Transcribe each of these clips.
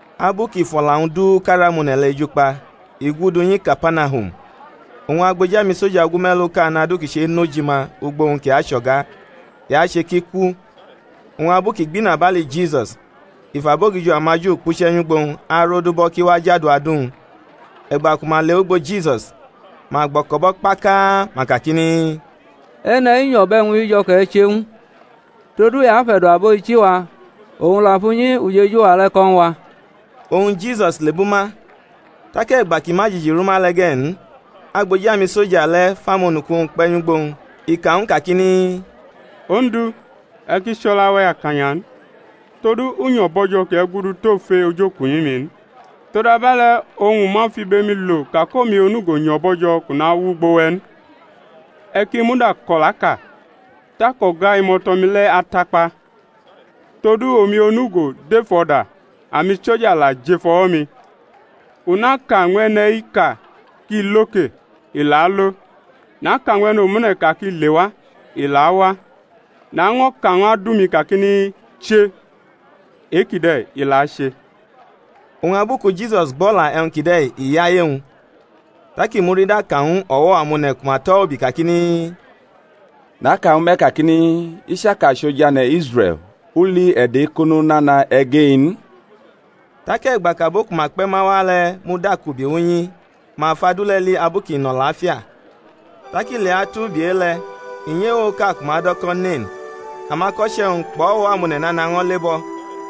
Abu kʼi fʼo̩la-wñ du ka rʼamone̩ le̩ eju kpa i gudu nyi Kapanahum. Oñ agboji amisoja ogume̩luʼka nʼadu kʼi che̩nʼojima ugbo-wñ kʼi acho̩ga, i ache ki ku. Oñ abu kʼi gbʼinabali Jisus, i fʼabogijo amaJu kpuche̩ nyʼugbo owñ, arodubʼo̩ kʼi wa jadu adu-wñ. E̩gba ku ma lewʼugbo Jisus, ma gboko̩bʼo̩ kpakaa, ma kakini, E̩ne̩-i nyo̩ bʼe̩wñ-i jo̩ kʼe̩ che ñw u, todu i afe̩do̩ abo-ichi-wa, owñ la fʼunyi ujeju-wa le̩ ko̩ ñw a. Oñ Jisus lebʼuma. Tak e̩gba kʼi ma jiji rʼunyi le̩ ge̩ n, agboji amisoja le̩ fʼamonuku-wñ kpe̩ nyʼugbo-wñ, i ka ñw u kakini, Ondu, e̩ ki chʼo̩la-we̩ akanya n; todu u nyo̩ bo̩jo̩ kʼe̩ gudu tʼofe ojokunyi-mi n; todabe̩le̩, oñ u ma fʼibe-mi lo ka kʼomi onugo nyo̩ bo̩jo̩ kʼu nawʼugbo we̩ n; e̩ ki muda kʼo̩laʼka, tak o̩ga imo̩to̩-mi le̩ atakpa. Todu omi onugo dʼef o̩da, amisoja la jʼef o̩wo̩-mi; u naka ñw e̩ne̩-i ka ki Lo ke, i la alo; naka ñw e̩ne̩ omune̩ ka ki Lewa, i la awa; naño̩ ka ñw adu-mi kakini, Che e-kide̩, i la ache. Oñ abu ku Jisus gbʼo̩la e̩wñ kide̩ i yaye-wñ, tak i murida ka ñw o̩wo̩ amone̩ ku ma tʼo̩ ubi kakini, Naka ñwu me̩ kakini, I chaka chʼoj ane̩ Israe̩l u li e̩do̩-ekono nana e̩ge-i n. Tak e̩gba kʼabo ku ma kpe̩ ma wa le̩ mudakubi wʼunyi, ma fʼadu le̩ li abu kʼi nʼo̩lafia. Tak ileatu ubi e-le̩, i nyʼewoʼka ku ma do̩ ko̩ Nen; amako̩che̩-wñ kpʼo̩wo̩-amone̩ nana ño̩ lebʼo̩.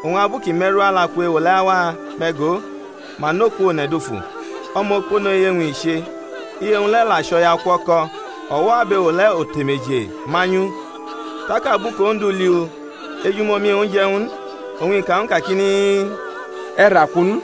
Oñ abu kʼi me̩ru alaku ewo le̩ awa, me̩ go, ma nʼoku one̩ dufu, o̩mokpono iye-wñ i che, iye-wñ le̩ la chʼo̩yaukuo̩ko̩; o̩wo̩ abewo le̩ otemeje manyʼu. Tak abu kʼOndu li u, ejumomi-wñ je̩ ñw u n, oñ i ka ñw u kakini, E̩ raku n.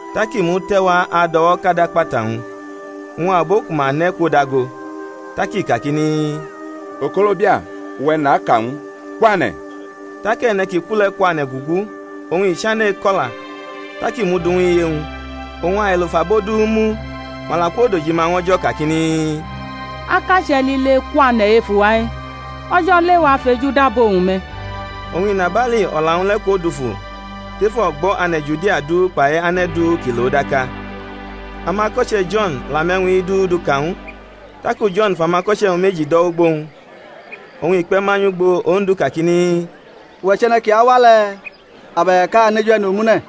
Tak i mute̩wa ado̩wo̩kadʼakpata-wñ, oñ abo ku ma nʼe̩ kwodago. Tak i kakini, Okolobia, uwe̩ naka ñw u, kwane̩! Tak e̩ne̩ ki ku le̩ kwane̩ gugu, oñ i chane̩ eko̩la. Tak i mʼu du ñw iye-wñ. Oñ ailo fʼabo du mu; ma la kwodojima ñw O̩jo̩ kakini, Akache̩ lile kwane̩ ef uwa-i, O̩jo̩ lewa fejudo abo-wñ me̩. Oñ inabali o̩la-wñ le̩ kwodufu tef o̩gbo̩ ane̩ Judia du kpai ane̩ du ki lʼo daka. Amako̩che̩ Jo̩n la mʼe̩wñ-i du duka ñw u. Taku Jo̩n fʼamako̩che̩-wñ meji do̩ wʼugbo-wñ, oñ i kpe̩ ma nyʼugbo Ondu kakini, Uwe̩ chʼe̩ne̩ ki awa le̩, abe̩k a aneju e̩ne̩ omune̩?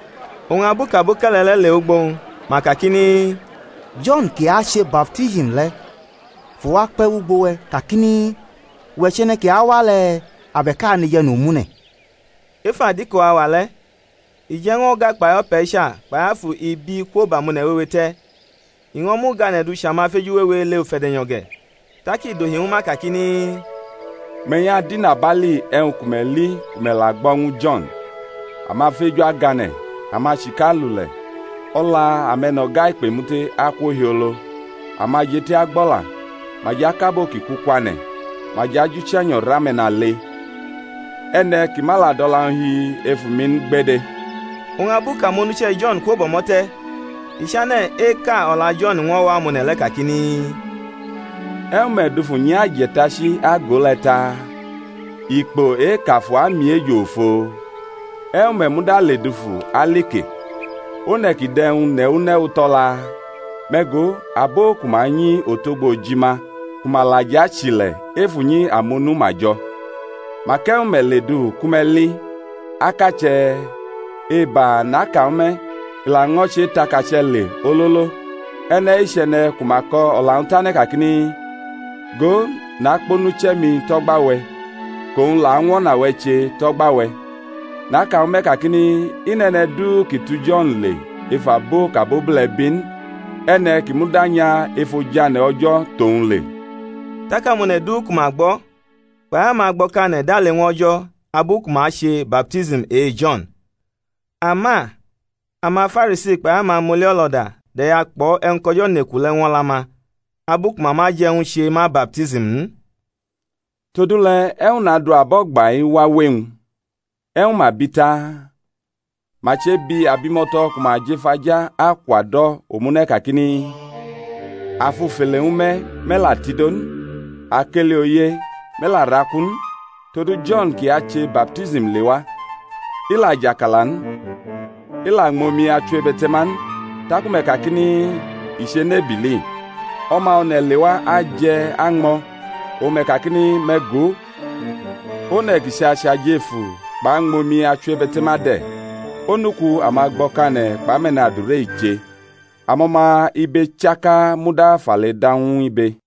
Oñ abu kʼaboke̩le̩ le̩ lewʼugbo-wñ ma kakini, Jo̩n kʼi ache baptism le̩ fʼuwu kpe̩ wʼugbo we̩ kakini, Uwe̩ chʼe̩ne̩ ki awa le̩, abe̩k a aneju e̩ne̩ omune̩? Ef adiko auwa le̩, i je̩ ñw o̩ga kpai o̩pe̩cha kpai afu ibi kwo bʼamone̩ wewe te̩; i ño̩ mʼugane̩ du chʼamafeju wewe ele ufe̩de̩nyo̩ ge̩. Tak i dohi ñwu ma kakini, Me̩ nyʼadʼinabali e̩wñ ku me̩ li ku me̩ la gbo̩ ñwu Jo̩n; amafeju agane̩, amachika alule̩, o̩la ame̩no̩ga ikpemute akwo hiolo; amajeti agbo̩la, ma jʼakʼabo ki ku kwane̩, ma jʼajʼuche̩nyo̩ rʼame̩nale; e̩ne̩ ki ma la dʼo̩la-wñ hi efu mi n gbede. Oñ abu kʼamonuche̩ Jo̩n kwo bʼo̩mo̩ te̩, i chane̩ eka o̩la Jo̩n ñw o̩wo̩-amone̩ le̩ kakini, E̩wñ me̩ dufu nyʼaje̩tachi ago le̩ taa? Ikpo e-kʼafu amiejo ofo? E̩wñ me̩ muda ledufu ali ke? One̩ kʼi dʼe̩wñ newu newu tʼo̩la? Me̩ go, abo ku ma nyi otogbo ojima ku ma la jʼachile̩ ef unyi amonu ma jo̩. Mak e̩wñ me̩ ledufu ku me̩ li? Akache̩? Eba, naka ñwu me̩, i laño̩ che tʼakache̩ le ololo. E̩ne̩-i chʼe̩ne̩ ku ma ko̩ o̩la-wñ tane̩ kakini, Go, nakpʼonuche̩-mi tʼo̩gba-we̩, kʼowñ la añwʼo̩na-we̩ che tʼo̩gba-we̩. Naka ñwu me̩ kakini, I nʼe̩ne̩ du ki tu Jo̩n le ef abo kʼabobule̩ bi n; e̩ne̩ ki muda nya ef ojane̩ O̩jo̩ tʼowñ le. Tak amone̩ du ku ma gbo̩, kpai amagbo̩kane̩ dale ñw O̩jo̩ abu ku ma che ma baptism e-Jo̩n. Ama amaFarisi kpai amamoli o̩lo̩da de̩ya kpo̩ e̩wñ kʼO̩jo̩ neku le̩ ñw o̩la-ma, abu ku ma ma je̩ ñw u che ma baptism n. Todule̩ e̩wñ nadu abo o̩gba-i wawe-wñ? E̩wñ ma bi taa? Ma chebi abimo̩to̩ ku ma jʼef aja akwado̩ omune̩ kakini, A fufele ñwu me̩, me̩ la tido n; a keli oye, me̩ la raku n. Todu Jo̩n kʼi ache baptism lewa, i la jʼakala n, i la ñmʼomi-achiwebete̩ma n, taku me̩ kakini, I chenʼebili. O̩ma One̩ lewa aje̩ añmo̩, oñ me̩ kakini, Me̩ go, one̩ ki chʼachʼajefu kpʼañmʼomi-achiwebe̩te̩ma de̩, onuku amagbo̩kane̩ kpʼame̩nadure i che! Amo̩ma ibe chaka muda fʼale da ñw ibe.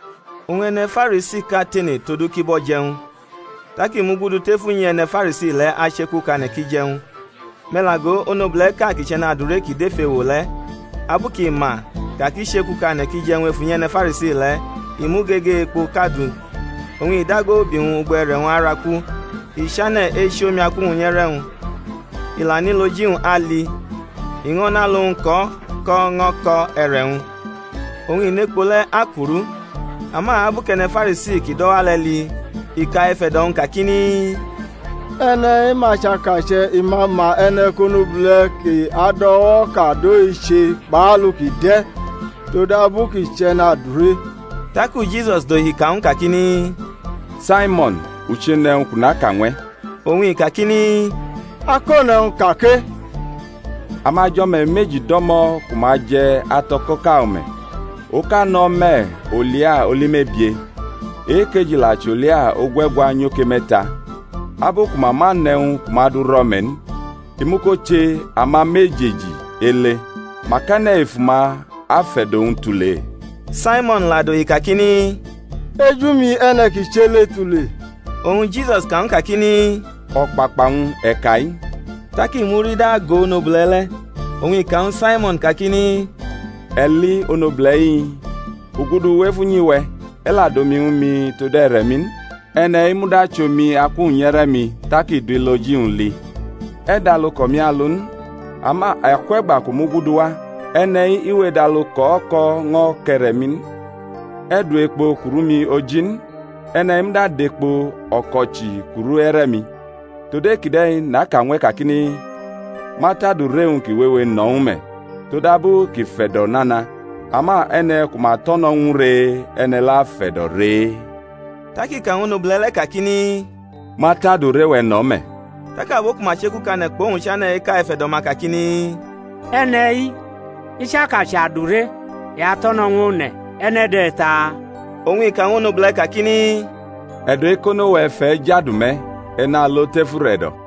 Oñ e̩ne̩ Farisiʼka tene todu kʼi bʼo̩ jʼe̩wñ. Tak i mugudu tef unyi e̩ne̩ Farisi le̩ achekukane̩ kʼi jʼe̩wñ. Me̩ la go, onobule̩ʼka kʼi chʼe̩nadure kʼi dʼef ewo le̩, abu kʼi ma ka kʼi chekukane̩ kʼi jʼe̩wñ ef unyi e̩ne̩ Farisi le̩, i mʼugege ekpoʼka du oñ i dago ubi wñ ugbo e̩re̩-wñ araku, i chane̩ echi omi aku-wñ nyʼe̩re̩-wñ, i la nʼilo-ji-wñ ali, i ño̩ nʼalu-wñ ko̩ ko̩ ño̩ ko̩ e̩re̩-wñ, oñ i nʼekpo le̩ akurʼu. Ama abu kʼe̩ne̩ Farisi ki dʼo̩ wa le̩ li, i ka ef e̩do̩-wñ kakini, E̩ne̩-i ma chʼakache̩ i ma ma e̩ne̩ kʼonobule̩ ki ado̩wo̩kadʼo-i che kpʼalu kʼi de̩, todabu kʼi chʼe̩nadure. Taku Jisus dohi ka ñw u kakini, Saimo̩n, u chenʼe̩wñ kʼu naka ñw e̩. Oñ i kakini, Akone̩wñ, ka ke. Amajo̩me̩ meji do̩mo̩ ku ma je̩ ato̩ko̩ʼka o̩me̩; oka nʼo̩ o̩me̩ olia oli mebie, e-ekeji la chʼolia ogue̩gwa nyoke me̩ta. Abu ku ma ma nʼe̩wñ ku ma du rʼo̩me̩ n, i muko che amamejeji ele. Mak e̩ne̩ ef uma afe̩do̩ owñ tule? Saimo̩n la dohi kakini, Eju-mi e̩ne̩ kʼi chʼe ele tule. Oñ Jisus ka ñw u kakini, O̩kpakpa-wñ e̩ ka-i. Tak i murida ago onobule̩ le̩, oñ i ka ñwu Saimo̩n kakini, E̩ li onobule̩-i? U gudu wʼef unyi-we̩, e̩ la dʼomi ñwu mi tod e̩re̩-mi n; e̩ne̩-i muda chʼomi aku-wñ nyʼe̩re̩-mi, tak i du iloji-wñ li. E̩ dʼalu kʼomi alu n; ama akwe̩gba kʼu muguduwa, e̩ne̩-i we edʼalu ko̩ ko̩ ño̩ kʼe̩re̩-mi n; e̩ du ekpo kuru mi oji n; e̩ne̩-i muda dʼekpo o̩ko̩chi kuru e̩re̩-mi. Tod e-kide̩ naka ñw e̩ kakini, Ma tʼadure-wñ ki wewe no̩ ñw u me̩, todabu kʼi fe̩do̩ nana; ama e̩ne̩ ku ma to̩no̩ ñw u ree, e̩ne̩ le̩ afe̩do̩ ree. Tak i ka ñw onobule̩ le̩ kakini, Ma tʼadure-we̩ no̩ me̩, tak abo ku ma chekukane̩ kpʼowñ chane̩ eka ef e̩do̩-ma kakini, E̩ne̩-i, i chaka chʼadure i ato̩no̩ ñw one̩, e̩ne̩ de̩ taa? Oñ i ka ñw onobule̩ kakini, E̩do̩-ekono-we̩ fʼe̩ jadu me̩; e̩ nalo tef ure̩do̩.